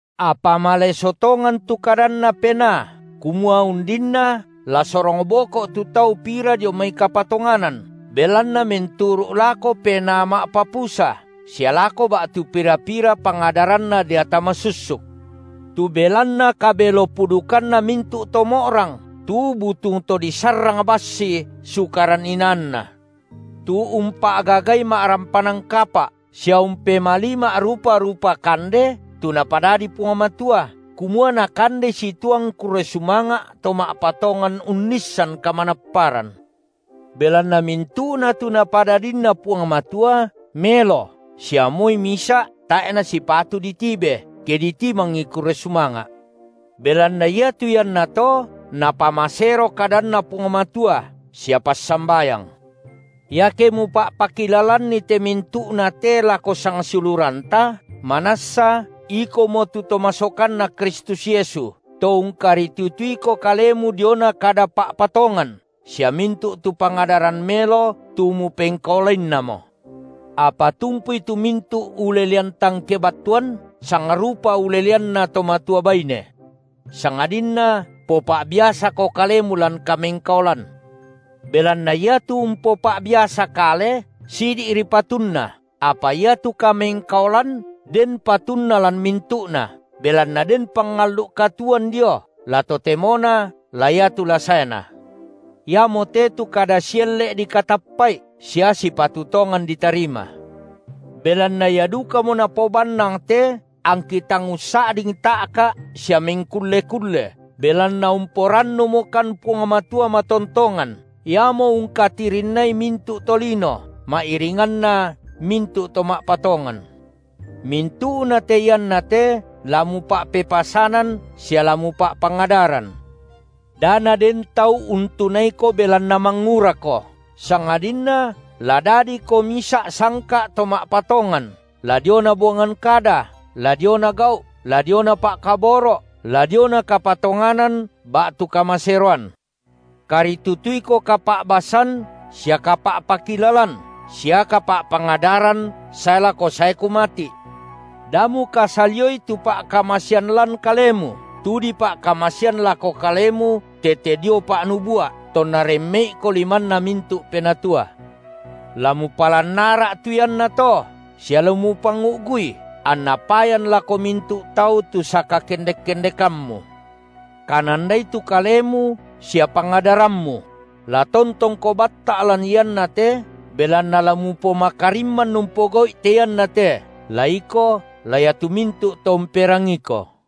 Apa maleso tongan tu kadanNa Penaa, kumua undinna, la sorong boko’ tu tau pira dio mai kapatonganan, belanna menturu’ lako penaa ma’papusa sia lako ba’tu pira-pira pangadaranna deata masussuk, tu belanna kabelo-pudukanna mintu’ to mo’rang, tu butung to disarrang bassi sukaran inaanna. Tu umpa’gagai ma’rampanan kapa’, sia umpemalii ma’rupa-rupa kande tu Napadadi Puang Matua, kumua nakandei situang kurre sumanga’ to ma’patongan, unnissan kamanapparan. Belanna mintu’na tu Napadadinna Puang Matua melo sia moi misa’ tae’ nasipatu ditibe, ke ditimangi kurre sumanga’, belanna iatu iannato napamasero kadanNa Puang Matua sia passambayang. Iake mupa’pakilalanni te mintu’na te lako sangsiuluranta, manassa ikomo tu to masokanNa Kristus Yesu, to ungkaritutuiko kalemu diona kada pa’patongan sia mintu’ tu pangadaran melo tu mupengkaolainnamo. Apa tumpui tu mintu’ ulelean tang kebattuan sangrupa uleleanna to matua baine. Sangadinna popa’biasako kalemu lan kamengkaolan. Belanna iatu umpopa’biasa kale sidi’ri patunna, apa iatu kamengkaolan den patunna lan mintu’na, belanna den pangallu’ katuoan dio, la totemona la iatu la saena. Iamote tu kada sielle’ dikatappa’i sia sipatu tongan ditarima. Belanna ia dukamo napobannang te angki tang ussa’ding ta’ka’ sia mengkulle-kulle, belanna umporannumokan Puang Matua matontongan, Iamo ungkatirinnai mintu’ tolino, ma’iringanna mintu’ to ma’patongan. Mintu’nate iannate la mupa’pepasanan sia la mupa’pangadaran. Da naden tau untunaiko belanna mangurako, sangadinna la dadiko misa’ sangka’ to ma’patongan, la diona buangan kada, la diona gau’, la diona pa’kaboro’, la diona kapatonganan ba’tu kamaseroan. Karitutuiko kapa’basan sia kapa’pakilalan sia kapa’pangadaran sae lako saeku mati’. Da mukasalioi tu pa’kamasean lan kalemu, tu dipa’kamasean lako kalemu tete dio pa’nubua’ tonna remme’iko limanna mintu’ penatua. La mupalan ara’ tu iannato, sia la mupangu’gui, anna payan lako mintu’ tau tu sakakendek-kendekammu. Kanandai tu kalemu sia pangadarammu; la tontongko batta’ lan iannate, belanna la mupomakarimman umpogau’i te iannate, la iko, la iatu mintu’ to umperangiiko.